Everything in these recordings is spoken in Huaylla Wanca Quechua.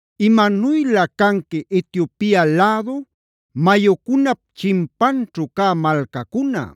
¡Imanuylä canqui Etiopia lädu mayucunap chinpanćhu cä malcacuna!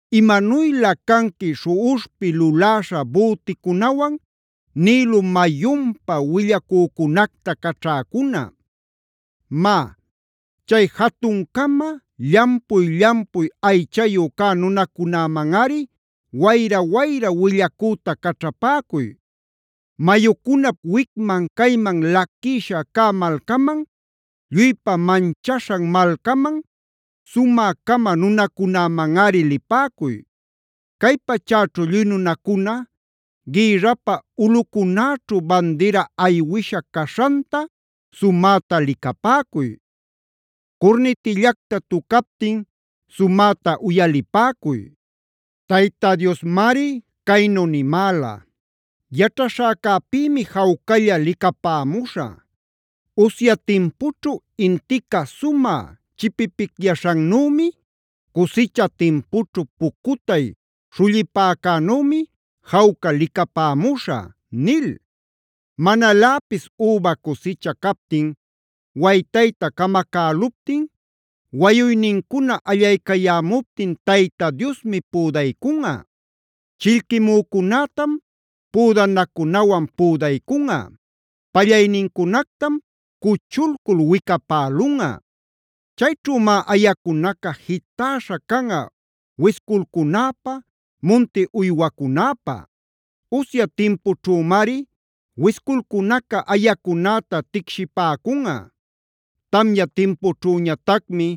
¡Imanuylä canqui śhuꞌuśhpi luläśha büticunawan Nilo mayunpa willacücunacta caćhäcuna! Má, chay jatun-cama, llampuy-llampuy aychayu cä nunacunämanꞌari wayra-wayra willacüta caćhapäcuy; mayucunap wicman cayman laquïsha cä malcaman, lluypa manchaśhan malcaman, sumä-cama nunacunämanꞌari lipäcuy. Cay pachäćhu lluy nunacuna, gïrrapä ulꞌucunäćhu bandira aywisha caśhanta sumäta licapäcuy. Curnitillacta tucaptin sumäta uyalipäcuy. Tayta Diosmari caynu nimäla: “Yaćhaśhäcäpïmi jawcalla licapämuśhä; usya timpućhu intica sumä chipipicyaśhannümi, cusicha timpućhu pucutay śhullipäcänümi jawca licapämuśhä” nil. Manaläpis üba cusicha captin waytayta camacäluptin, wayuynincuna allaycayämuptin Tayta Diosmi püdaycunꞌa. Chillquimücunätam püdanacunawan püdaycunꞌa; pallaynincunactam cuchulcul wicapälunꞌa. Chayćhümá ayacunaca jitäśha canꞌa wisculcunäpä, munti uywacunäpä. Usya timpućhümari wisculcunaca ayacunäta ticshipäcunꞌa; tamya timpućhüñatacmi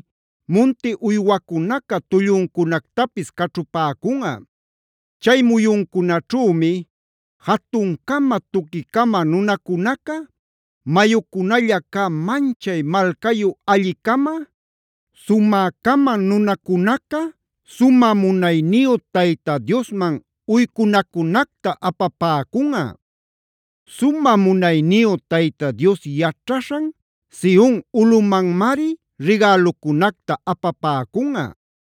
munti uywacunaca tulluncunactapis caćhupäcunꞌa. Chay muyuncunaćhümi jatun-cama, tuqui-cama nunacunaca, mayucunalla cä manchay malcayu alli-cama, sumä-cama nunacunaca, sumä munayniyu Tayta Diosman uycunacunacta apapäcunꞌa. Sumä munayniyu Tayta Dios yaćhaśhan Sion ulꞌumanmari rigälucunacta apapäcunꞌa.